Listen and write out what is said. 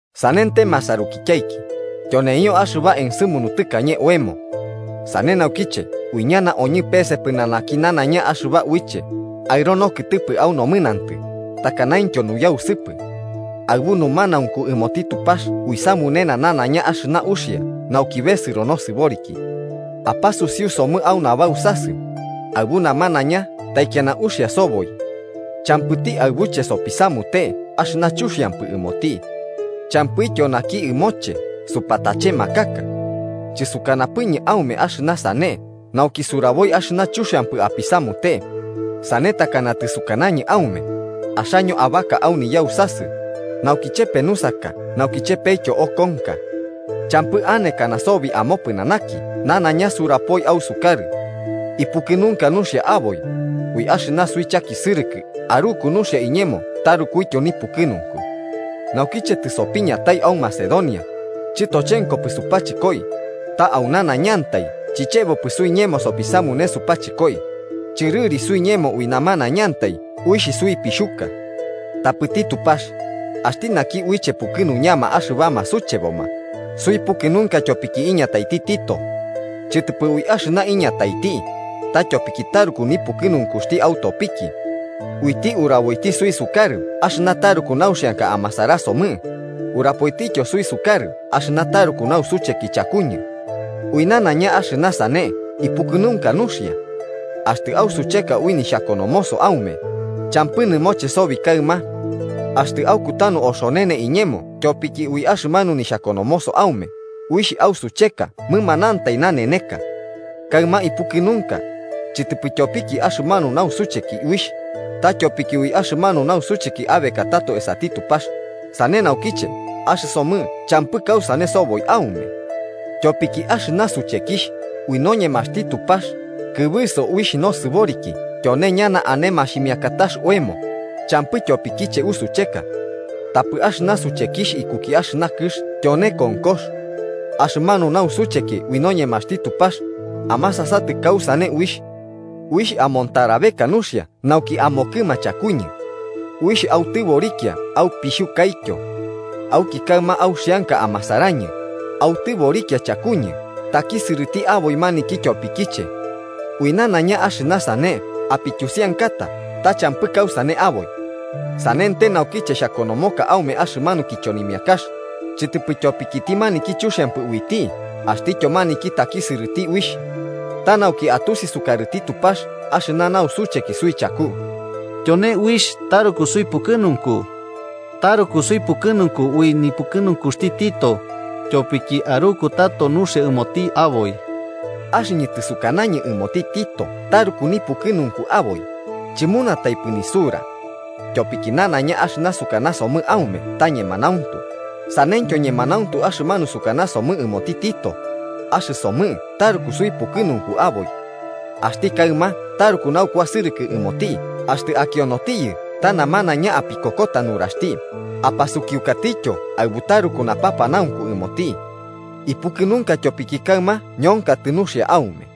Sanente, masarukityaiki, tyoneio axɨba ensɨmunu tɨkañe oemo. Sane naukiche uiñana oñɨ pese pɨnanaki nanaiña axɨba uiche aɨro nokɨtɨpɨ au nomɨnantɨ takanaintyo nuyausɨpɨ. Aɨbu numanaunku ɨmoti Tupax uisamunena nanaiña axɨna uxia nauki besɨro nosɨboriki. ¡Apasusiu somɨ au nabausasɨ! Aɨbu namanaiña taikiana uxia soboi. Champɨti aɨbuche sopisamute axɨna chuxiampɨ ɨmoti. Champɨtityo naki ɨmoche supatachemakaka. Chɨsukanapɨñɨ aume axɨna sane nauki suraboi axɨna chuxiampɨ apisamute, sane takana tɨsukanañɨ aume, axaño abaka au niyausasɨ, nauki chepe nusaka nauki chepetyo okonka. Champɨ anekana sobi amopɨnanaki nanaiña surapoi ausukarɨ. Ipukɨnunka nuxia aboi. Ui axɨna suichakisɨrɨkɨ aruku nuxia iñemo tarukuityo nipukɨnunku. Naukiche tɨsopiñatai au Macedonia, chɨtochenkopɨ supachɨkoi, ta au nanaiñantai chichebopɨ suiñemo sopisamune supachɨkoi: chɨrɨri suiñemo ui namanaiñantai uixh suipixhuka. Tapɨti Tupax, axti naki uiche pukɨnuñama axɨbama sucheboma, suipukɨnunka tyopiki iñataiti Tito. Chɨtɨpɨ ui axɨna iñataiti, ta tyopiki taruku nipukɨnunkuxti autopiki. Uiti uraboiti suisukarɨ axɨna taruku nauxianka amasarasomɨ, urapoitityo suisukarɨ axɨna taruku nausucheki chakuñɨ. Ui nanaiña axɨna sane ipukɨnunka nuxia. Axtɨ ausucheka ui nixhakonomoso aume, champɨ nɨmoche sobi kaɨma. Axtɨ aukutanu oxonene iñemo tyopiki ui axɨmanu nixhakonomoso aume uixh ausucheka mɨmanantai naneneka. Kaɨma ipukɨnunka. Chɨtɨpɨ tyopiki axɨmanu nausucheki uixh, ta tyopiki ui axɨmanu nausucheki abekatato esati Tupax, sane naukiche axɨsomɨ champɨ kausane soboi aume. Tyopiki axɨna suchekixh ui noñemaxti Tupax kɨbɨso uixh nosɨboriki tyone ñana ane maximiakatax oemo, champɨ tyopikiche usucheka. Tapɨ axɨna suchekixh ikuki axɨna kɨx tyone konkox. Axɨmanu nausucheki ui noñemaxti Tupax, ¡amasasatɨ kausane uixh! Uixh amontarabeka nuxia nauki amokɨma chakuñɨ. Uixh autɨborikia aupixhukaityo. Auki kaɨma auxianka amasarañɨ, autɨborikia chakuñɨ takisɨrɨti aboi maniki tyopikiche. Ui nanaiña axɨna sane apityusiankata ta champɨ kausane aboi. Sanente, naukiche xhakonomoka aume axɨmanu kichonimiakax, chɨtɨpɨ tyopikiti maniki chuxiampɨ uiti axtityo maniki takisɨrɨti uixh, ta nauki atusi sukarɨti Tupax axɨna nausucheki suichaku. Tyone uixh taruku suipukɨnunku. Taruku suipukɨnunku ui nipukɨnunkuxti Tito, tyopiki aruku tato nuxia ɨmoti aboi. Axɨñɨ tɨsukanañɨ ɨmoti Tito taruku nipukɨnunku aboi, chɨmunataipɨ nisura. Tyopiki nanaiña axɨna sukanasomɨ aume ta ñemanauntu, saneityo ñemanauntu axɨmanu sukanasomɨ ɨmoti Tito: axɨsomɨ taruku suipukɨnunku aboi. Axti kaɨma taruku naukuasɨrɨkɨ ɨmoti axtɨ akionotiyɨ ta namanaiña apikokota nuraxti apasukiukatiyo aɨbu taruku napanaunku ɨmoti. ¡Ipukɨnunka tyopiki kaɨma ñonkatɨ nuxia aume!